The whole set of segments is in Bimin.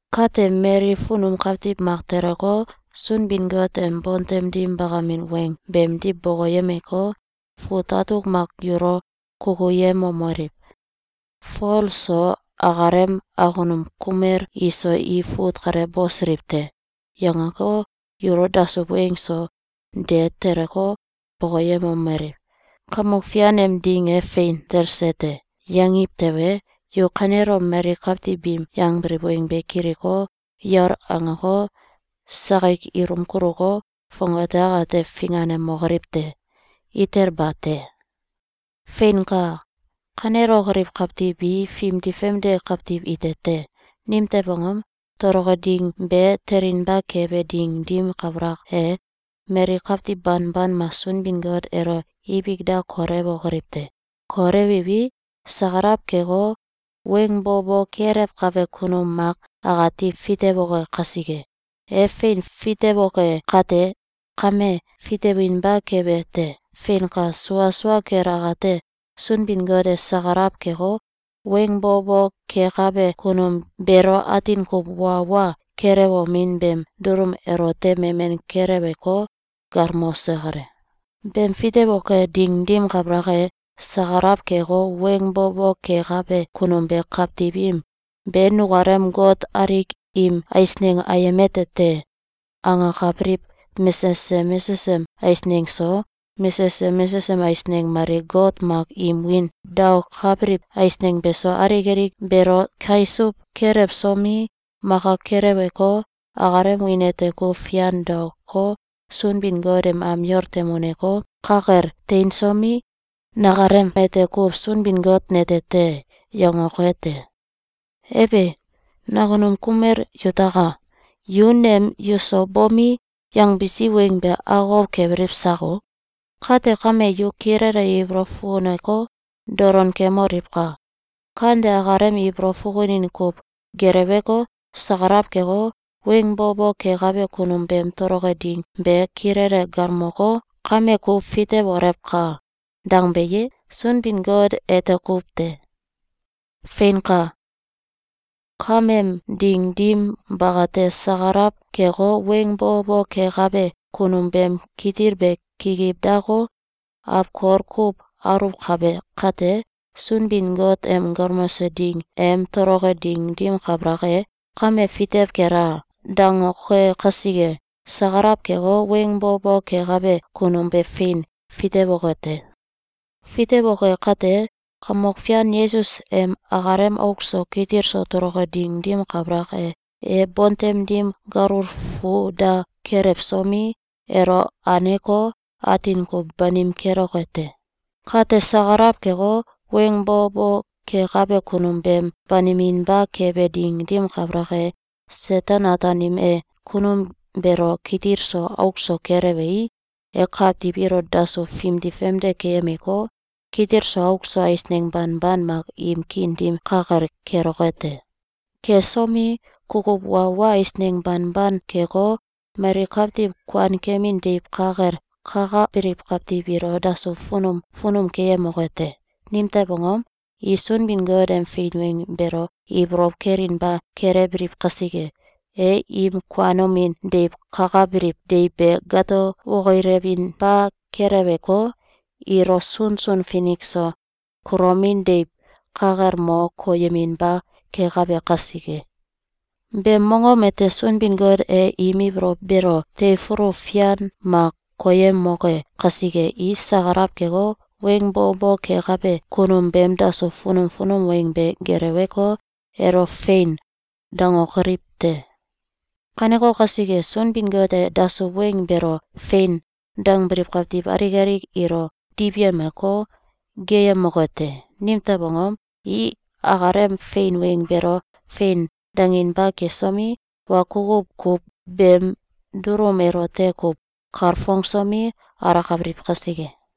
Kate, mali funum kawtiw mak teleko, Sunbin-Got em bontem dim bakamin weng beemdiw bokoyemeko, fut atuk mak yulo kukuyemomeliw: “Fol so akalem akunum kumel iso i fut kale bosiliw te!”, yangeko, yulo dasuw weng so de teleko, bokoyemomeliw: “Kamok Fian em Ding e fein telse te!”, yangiw tewe, yu kanelom mali kawtiw biim yangbiliw weng be kiliko, yol angeko, sakik ilum kuluko, fongate akate finganemokoliw te! Itel bate! Feinka! Kanelokoliw kawtiw bi fimdi famde kawtiw ite te. Nimtew angom? Toloke ding be telinba kebe ding dim kabalak e, mali kawtiw banban mak Sunbin-Got elo ibik da kolewokoliw te. Kolewiwi, sakalaw keko, weng bo bo kelewkabe kunum mak akati fitewoke kasike. E fein fitewoke kate kame, fitewinba kebe te. Feinka! Sua sua kel akate, Sunbin-Got e sakalaw keko, weng bo bo kekabe kunum beelo atin kuw wa wa kelewomin beem dulum elote memen keleweko, galmose kale. Beem fitewoke ding dim kabalak e, sakalaw keko, weng bo bo kekabe kunum be kawtiw im “Be nukalem got alik im eisneng ayem ete te!”, angakabiliw mesesem mesesem eisneng so, mesesem mesesem eisneng mali got mak im wiin daokabiliw eisneng beso, alik alik beelo keisuw kelewsomi, maka keleweko, akalem wiin ete kuw fian daoko, Sunbin-Got em am yol tem uneko, ka kel teinsomi, “Nakalem ete kuw Sunbin-Got nete te!”, yangoke te. Ebe! Nakunum kumel yutaka! Yu nem yuso bomi, yangbisi weng be akokow kebiliw sako? Kate kame, yu kilele ibolow fukuneko, dolon kemoliwka! Kante akalem ibolow fukunin kuw geleweko, sakalaw keko, weng bo bo kekabe kunum beem toloke ding be kilele galmoko, “Kame ku fitewolewka!”, dangbe ye? Sunbin-Got ete kuw te! Feinka! Kameem ding dim bakate, sakalaw keko, weng bo bo kekabe kunum beem kitil be kikiw dako, awkol kuw aluwkabe kate, Sunbin-Got em galmose ding em toloke ding dim kabalak e, “Kame fitew kela!”, dangoke kasike, sakalaw keko, weng bo bo kekabe kunum be fein fitewoke te. Fitewoke kate, Kamok Fian Yesus em akalem auk so kitil so toloke ding dim kabalak e, e bontem dim galul fu da kelewsomi, elo aneko, atin kuw banim keloke te. Kate, sakalaw keko, weng bo bo kekabe kunum beem baniminba kebe ding dim kabalak e, Seten-Ataanim e kunum beelo kitil so auk so kelewei, e kawtiw ilo dasuw fimdi famde keyemeko, kitil so auk so eisneng banban mak im kiin dim ka kel keloke te. Kesomi, kukuw wa wa eisneng banban keko, mali kawtiw kuankemin deiw ka kel kakabiliw kawtiw ilo dasuw funum funum keyemoke te. Nimtew angom? I Sunbin-Got em fein weng beelo ibolow kelinba kelewbiliw kasike, e im kuanomin deiw kakabiliw deiw be gato wokilewinba keleweko, ilo sunsun finik so kulomin deiw ka kel mo koyeminba kekabe kasike. Beem mongom ete Sunbin-Got e im ibolow beelo teifulu fian mak koyemoke kasike, i sakalaw keko, weng bo bo kekabe kunum beem dasuw funum funum weng be geleweko, elo, “Fein!”, dangokoliw te. Kaneko kasike, Sunbin-Got e dasuw weng beelo “Fein!”, dangbiliw kawtiw alik alik ilo diwyemeko, geeyemoke te. Nimtew angom? I akalem fein weng beelo “Fein!”, danginba kesomi, wa kukuw kuw beem dulum elote kuw kalfongsomi, alakabiliw kasike.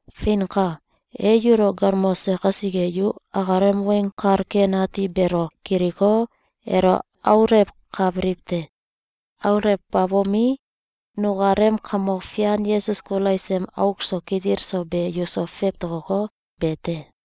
Feinka! E yulo galmose kasike, yu akalem Weng Kal Ken Ati beelo kiliko, elo aulewkabiliw te. Aulewbabomi, nukalem Kamok Fian Yesus Kulais em auk so kitil so be yuso fewtokoko, be te.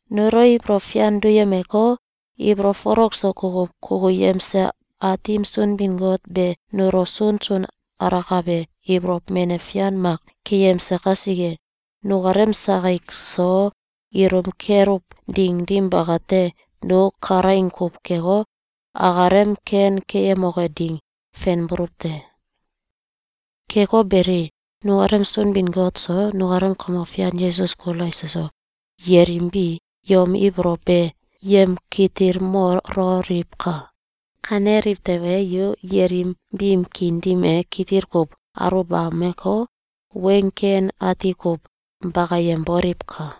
Nulo ibolow fian duyemeko, ibolow folok so kukuw kukuyemse Aatim Sunbin-Got be nulo sunsun alakabe ibolow menew fian mak keyemse kasike, nukalem sakik so ilum keluw ding ding bakate, nu kalaing kuw keko, akalem ken keyemoke ding fenbuluw te. Keko beli, nukalem Sunbin-Got so, nukalem Kamok Fian Yesus Kulais eso, yelim bi yom ibolow be yemkitilmololiwka! Kaneliw tewe, yu yelim biim kiin dim e kitil kuw aluwbameko, weng ken ati kuw bakayemboliwka!